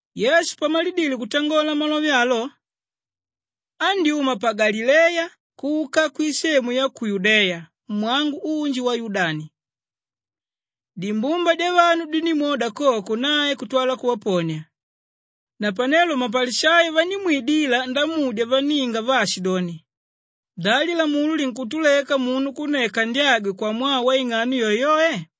Yesu pamalidile kutangola malove alo, andyúma pa Galileya kuka kwisemu ya ku Yudeya mwangu unji wa Yudani. Dimbumba dyavanu dindímwoda koko, nae kutwala kuvaponia. Napanelo mapalishayo vandímwidila ndamudya vanninga vaashidoni, “Da lilamula linkutuleka munu kunneka ndyagwe kwamwaa waing'ano yoeyoe?”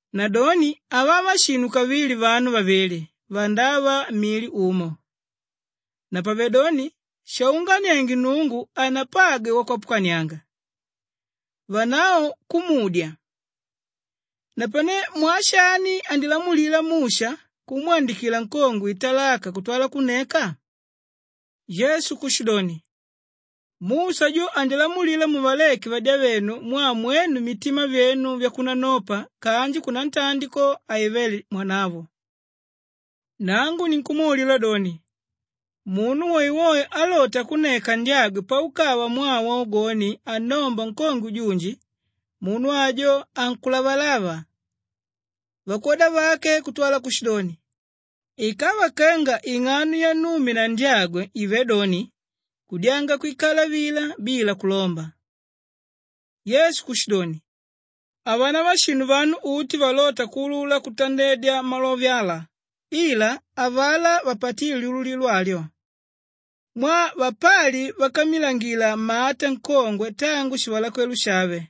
Nadoni havava shinu kavili vanu vavili vandava mili umo. Napavedoni shaunganienge Nnungu hanapagwe wakwapukanianga.” Vanavo kumudya, “Napane mwaa shani andilamulila Musha kumwandikila nkongwe italaka kutwala kunneka?” Yesu kushidoni, “Musha jo andilamulila muvaleke vadyavenu mwaa mwenu mitima vyenu vyakunanopa kanji kunantandi ko, haivé mwanavo. Nangu ninkumwaulila doni, munu woewoe álota kunneka ndyagwe paukava mwaa waugoni annomba nkongwe junji, munu ajo ankulavalava.” Vakwoda vake kutwala kushidoni, “Ikava kenga ing'ano yannume na ndyagwe ive doni, kudyanga kwikala vila bila kulomba.” Yesu kushidoni, “Havanava shinu vanu uti valóta kuulula kutandedya malove ala ila avalá vapatíle lyululilo alyo. Mwaa vapali vákammilangila mata nkongwe tangu shivalakwelo shave,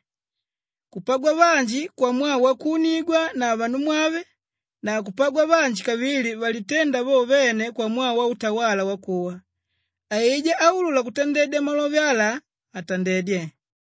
kupagwa vanji kwamwaa wakuunigwa na vanumwave na kupagwa vanji kavili valiténda vo vene kwamwaa wautawala wakuwa. Aijá áulula kutandedya malove ala, atandedye.”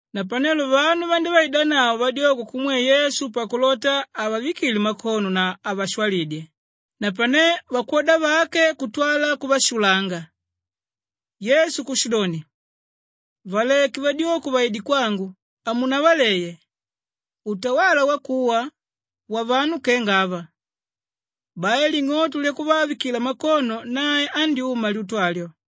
Napanelo vanu vandívaidanavo vadyoko kumwe Yesu pakulota avavikile makono na avashwalidye, napane vakwoda vake kutwala kuvashulanga. Yesu kushidoni, “Valeke vadyoko vaide kwangu, hamunavaleye! Utawala wakuwa wavanu kenga ava.” Bai ling'oto lyakuvavikila makono, nae andyúma lyutu alyo.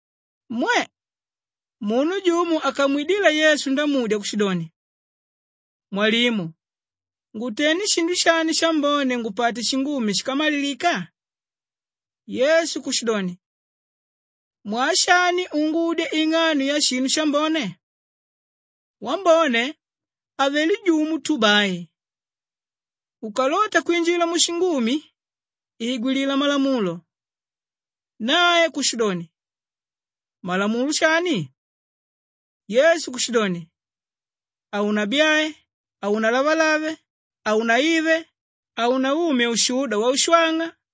Mwe! Munu jumo akamwidila Yesu ndamudya kushidoni, “Mwalimu ngutende shinu shani shambone ngupate shingumi shíkamalilika?” Yesu kushidoni, “Mwaa shani ungudya ing'ano yashinu shambone? Wambone avelé jumo tu bai. Ukalota kwinjila mushingumi, igwilila malamulo.” Nae kushidoni, “Malamulo shani?” Yesu kushidoni, “Haunabyae, haunalavalave, haunaive, haunaumye ushuda waushwang'a,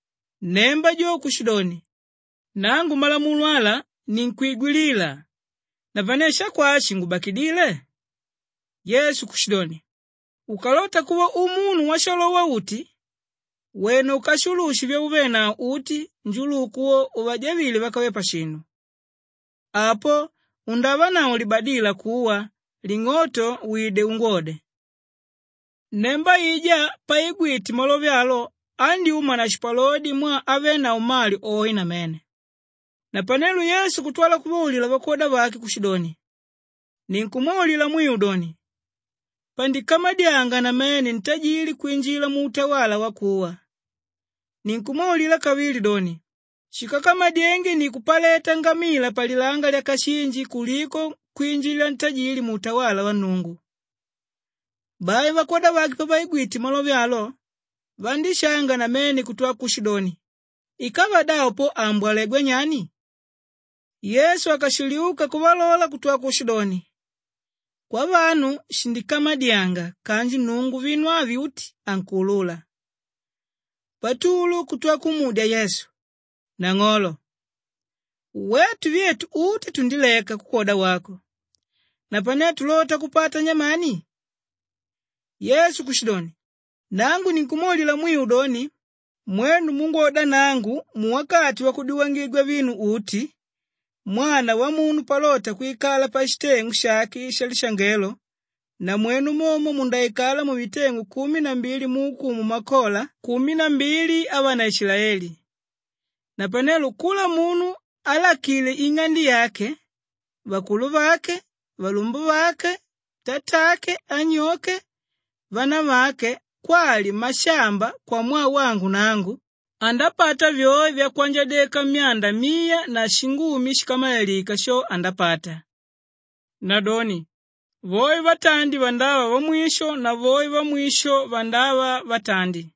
Nnemba jo kushidoni, “Nangu malamulo ala ninkwigwilila, napane shakwashi shingubakidile?” Yesu kushidoni, “Ukalota kuva umunu washalowa-uti wena ukashulushe vyauvenavo uti, njuluku wo uvajavile vákave pashinu. Apo undavanavo libadila kuwa ling'oto wide ungwode.” Nnemba aijá paigwite malove alo andyúma na shipalodi mwaa avenavo mali oe namene. Napanelo Yesu kutwala kuvaulila vakwoda vake kushidoni, “Ninkumwaulila mwiu doni, pandikamadyanga namene ntajili kwinjila muutawala wakuwa. Ninkumwaulila kavili doni, shíkakamadyenge ni kupaleta ngamila palilanga lyakashinji kuliko kwinjila ntajili muutawala wa Nnungu.” Bai vakwoda vake pavaigwite malove alo, vandíshanga namene kutwala kushidoni, “Ikava davo po aambwalegwa nyani?” Yesu akashiliuka kuvalola kutwa kushidoni, “Kwavanu shindikamadyanga kanji Nnungu vinu uti ankuulula.” Patulu kutwa kumudya Yesu, “Nang'olo! Wetu vyetu uti tundileka kukwoda wako, napane tulota kupata nyamani?” Yesu kushidoni, “Nangu ninkumwaulila mwiu doni, mwenu múngwoda nangu muwakati wakudyuwangigwa vinu uti, Mwana Wamunu palota kwikala pashiteng'u shake shalishangelo, namwenu momo mundaikala muviteng'u kumi na mbili muukumu makola kumi na mbili avanaishilaeli. Napanelo kula munu álakile ing'ande yake, vakuluvake, valumbuvake, tatake, anyoke, vanavake kwali mashamba kwamwaa wangu nangu, andapata vyoe vyakwanjadyeka myanda miya na shingumi shíkamalilika sho, andapata. “Nadoni voe vatandi vandava vamwisho na voe vamwisho vandava vatandi.